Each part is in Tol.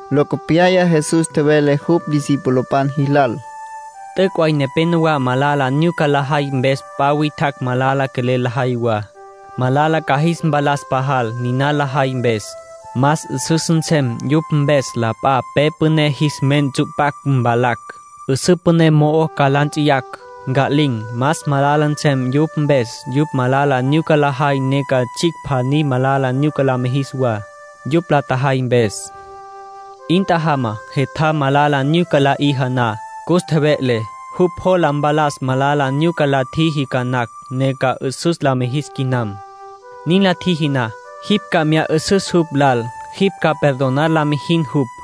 Locopyaya Jesús tjevele jupj discipulopan jilal: —T'üc' way nepénowa malala nyuca lajay mpes p'a witjacj malala quelel lajay wa. Malala ca jis mpalas pajal, niná lajay mpes. Más 'üsüs nsem yupj mpes la p'a pe püné jis men ntsu'pacj mvalacj, 'üsǘ püné mo'o ca la nts'iyacj, nca'lin̈. Más malala nsem yupj mpes yupj malala nyuca lajay ne ca tsjicj pjaní malala nyuca la mijis wa, yupj la tjajay mpes. 'In tjajama. ”Jetjam malala nyuca la 'iji na, cus tjeve'le. Jupj jola mpalas malala nyuca la tjiji ca nacj, ne ca 'üsüs la mijis quinam. Nin la tjiji na, jipj ca mya 'ü'süs jupj lal. Jipj ca perdonar la mijin jupj.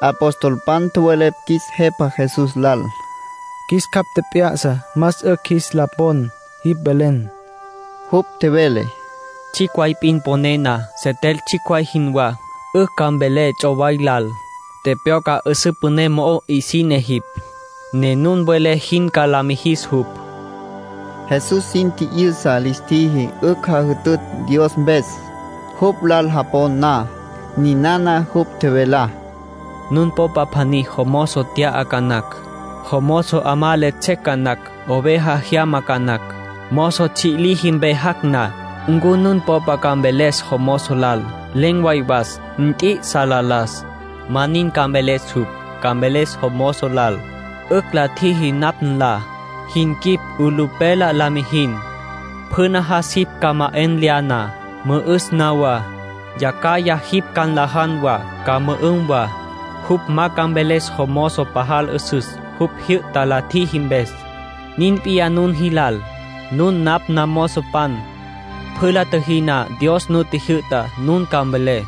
Apostolpan tjowelepj qjuis Jepa Jesús lal: —Qjuis capj tjep'ya'sa más 'ücj qjuis la pon jipj velen. Jupj tjevele: —Tsjicj way p'in poné na, setel tsjicj way jinwá, 'ücj ca mvelé ts'oway lal: ‘Tepyocja, 'üsǘ püné mo'o 'isine jipj’. Ne nun welé jin ca la mijis jupj —nin tjevele Jesús. (Jesús sin tji'yüsa lis tjiji 'ücj jajütütj Dios mpes, jupj lal japon na.) Ninana jupj tjevelá: —Nun popa pjaní jomozo tya'á ca nacj. Jomozo 'amá le tsjec ca nacj, oveja jyama ca nacj. Mozo tsji' liji mpe jac' na, ¿ncu nun popa ca mveles jomozo lal: ‘Len̈ way was. Nt'i'isa la las?’ Ma nin ca mveles jupj. Ca mveles jomozo lal: ‘'Ücj la tjiji napj nla. Jin quip 'ulupela la mijin. Pjü najas jipj ca ma 'en lya na, mü'üs na wa. Yacjaya jipj ca nlajan wa, ca mü'üm wa.’ Jupj ma ca mveles jomozo pajal 'üsüs, jupj tjijyü'ta la tjiji mpes. Nin p'iyá nun jilal. Nun napj namozopan. Pjü la tjüjí na Dios nu jyü'ta, nun ca mvelé: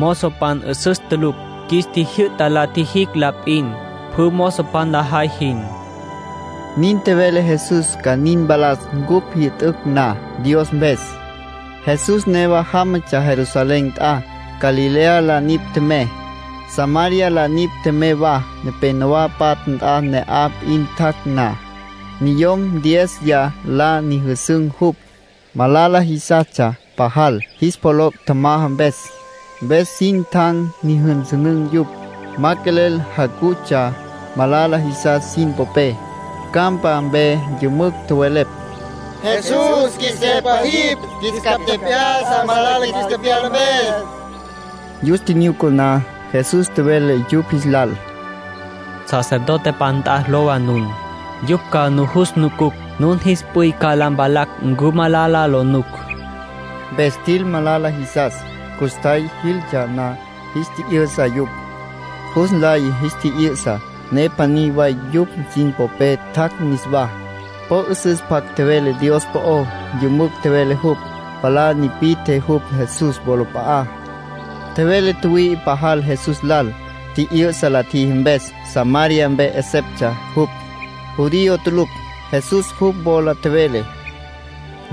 ‘Mozopan 'üsüs tulucj cupj. Qjuis tjijyü'ta la tjijicj la p'in, pjü mozopan lajay jin’ (—nin tjevele Jesús ca nin mpalas cupj jyü'tücj na Dios mpes.) Jesús newa jámatsja Jerusalén nt'a. Galilea la nipj tjemey, Samaria la nipj tjemey wa. Nepénowa patja nt'a ne'aj p'in tjac' na, niyom diéziya la nyüjüsün̈ jupj. Malala jisastsja pajal, jis pjoloc' tjamaja mpes. Mpes sin tjan nyüjünsünün̈ yupj. Ma quelel jacutsja malala jisas sin popé. Campa mpe yümücj tjowelepj: —Jesús, qjuis Jepa jipj. Qjuis capj tjep'ya'sa, malala qjuis tepyala mpes. Yus tjinyuca na, Jesús tjevele yupj jis lal: —Sacerdotepan nt'a lowa nun. Yupj ca nujus nucucj, nun jis p'üy ca la mpalacj ncu malala lo nuc —tjevele Jesús. Mpes tjil malala jisas. Custjay jiltsja na, jis tji'yü'sa yupj. Jus nlay jis tji'yü'sa, ne pjaní way yupj sin popé tjac' niswá. Po 'üsüs pjac tjevele Dios po'ó. Yümücj tjevele jupj. Palá nipi'tje jupj Jesús wolap'a'á. Tjevele tjüwüi'i pajal Jesús lal, tji'yü'sa la tjiji mpes. Samaria mpe 'eseptsja jupj, judío tulucj. Jesús jupj wola tjevele: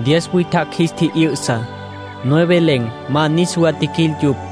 —Diez witjacj jis tji'yü'sa. Nueve len̈, ma niswa tjiquil yupj.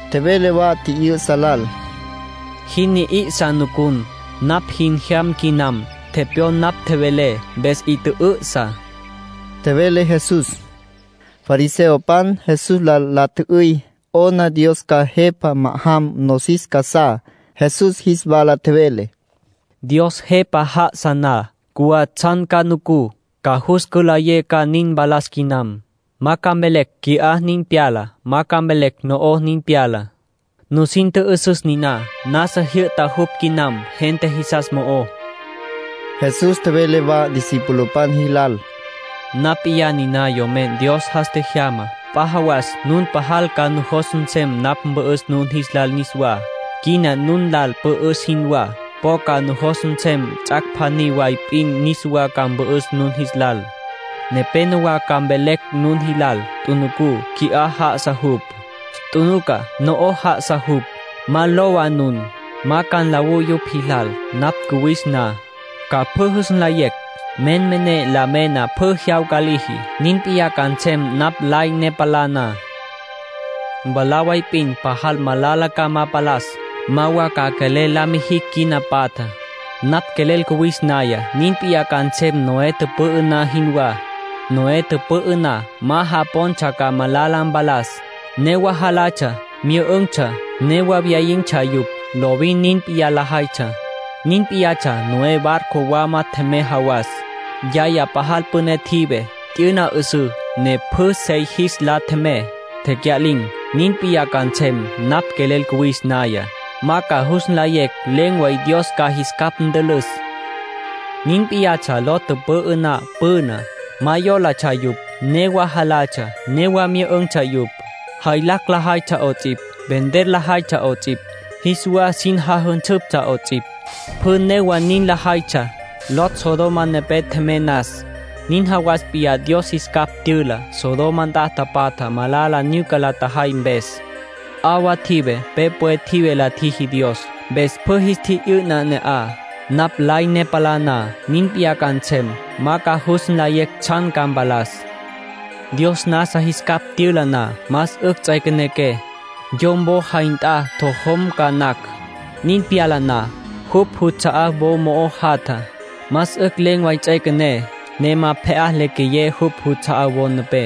Tjevele wa tji'yü'sa lal: —Jin ni'isa nucun, napj jin jyam quinam. Tepyon napj tjevelé, mpes 'i tjü'ü'sa —tjevele Jesús. Fariseopan Jesús lal la tjü'üy 'ona Dios ca Jepa ma'ajam nosis casá. Jesús jis wala tjevele: —Dios Jepa já'asa na, cjuwá tsjan ca nucú, ca jus cülayé ca nin mpalas quinam. Ma ca mvelecj: ‘Qui'á nin pyala’. Ma ca mvelecj: ‘No'oj nin pyala’. Nusin tjü'üsüs nina: nasa jyü'ta jupj quinam, gente jisas mo'ó. Jesús tjevele wa discipulopan jilal: —Napj p'iyá niná Yomen Dios jas tjejyamá. P'a jawas nun pajal ca nujos nsem napj mpü'üs nun jis lal niswá, quina nun lal pü'üs jinwá. Po ca nujos nsem ts'ac' pjaní way p'in niswa ca mpü'üs nun jis lal. Nepénowa ca mvelecj nun jilal: ‘Tjunuca. Qui'á já'asa jupj. Tjunuca. No'oj já'asa jupj.’ Ma lowa nun. Ma ca nlawú yupj jilal. Napj cuwis na, ca pjü jus nlayecj. Menmené la mena pjü jyawca liji; nin p'iyá ca nsem napj lay ne palá na. Mwalá way p'in pajal malala ca ma palas; ma wa ca quelel la ma jicj quina patjá. ”Napj quelel cuwis naya, nin p'iyá ca nsem Noé tüpü'ü na jinwá. Noé tüpü'ü na, ma japontsja ca malala mpalas. Newa jalatsja, myü'ün̈tsja. Newa wyayin̈tsja yupj. Lovin nin p'iyá lajaytsja. Nin p'iyatsja Noé barco wama tjemey jawas. Yacjaya pajal püné tjive. T'yüna 'üsǘ, ne pjü sey jis la tjemey, tecya'lin̈. (Nin p'iyá ca nsem, napj quelel cuwis naya. Ma ca jus nlayecj len̈ way Dios ca jis capj ntülüs.) ”Nin p'iyatsja Lot tüpü'ü na püná. Ma yólatsja yupj. Newa jalatsja, newa myü'ün̈tsja yupj. Jaylacj lajaytsja 'ots'ipj, vender lajaytsja 'ots'ipj, jis wa sin jajünsüptsja 'ots'ipj. Pjü newa nin lajaytsja, Lot Sodoma nepé tjemey nas. (Nin jawas p'iyá Dios jis capj tyüla Sodoma nt'a tapatjá, malala nyuca la tjajay mpes.) 'Awa tjive, pe pwe tjive la tjiji Dios, mpes pjü jis tji'yü'na ne'aj. Napj lay ne palá na, nin p'iyá ca nsem. (Ma ca jus nlayecj tsjan ca mpalas.) ”Dios nasa jis capj tyüla na, más 'ücj ts'üequenequé. Yom wo jay nt'a ntojom ca nacj, nin pyala na. Jupj juts'a'á wo mo'ó jatja. Más 'ücj len̈ way ts'üequené, ne ma pje'á le queyé jupj juts'a'á wo nepé.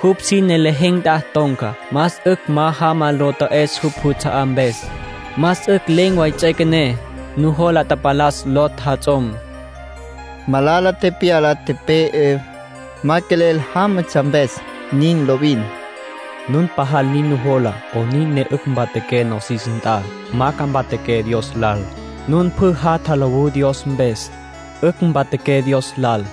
Jupj sine lejen̈ nt'a ton̈ca, más 'ücj ma jama lo ta'es jupj juts'a'á mpes. Más 'ücj len̈ way ts'üequené. Nujola tapalas Lot jats'om. (Malala tepyala, tepe'e, ma quelel jámatsja mpes.) (Nin lovin.) Nun pajal nin nujola 'onin ne 'ücj mpatjaqué nosis nt'a, ma ca mpatjaqué Dios lal. Nun pjü jatja lowú Dios mpes, 'ücj mpatjaqué Dios lal.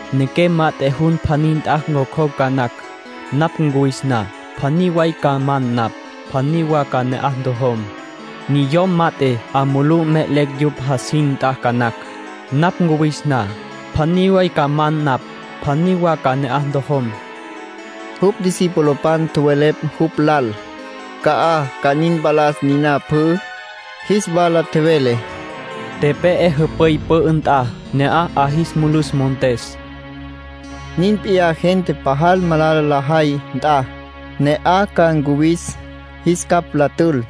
Nequem mat'e jun pjaní nt'a ncjocjocj ca nacj, napj cuwis na. Pjaní way ca man napj. Pjaní wa ca ne'aj ntojom. Niyom mat'e 'a mulú me'elecj yupj jasin nt'a ca nacj, napj cuwis na. Pjaní way ca man napj. Pjaní wa ca ne'aj ntojom —tjevele Jesús. Jupj discipulopan tjowelepj jupj lal: —¿Ca'aj ca nin mpalas niná pjü? Jis wala tjevele: —Tepe'e jüp'üy pü'ü nt'a, ne'aj 'a jis mulus montes. (Nin p'iyá gente pajal malala lajay nt'a, ne'aj ca ncuwis, jis capj la tül.)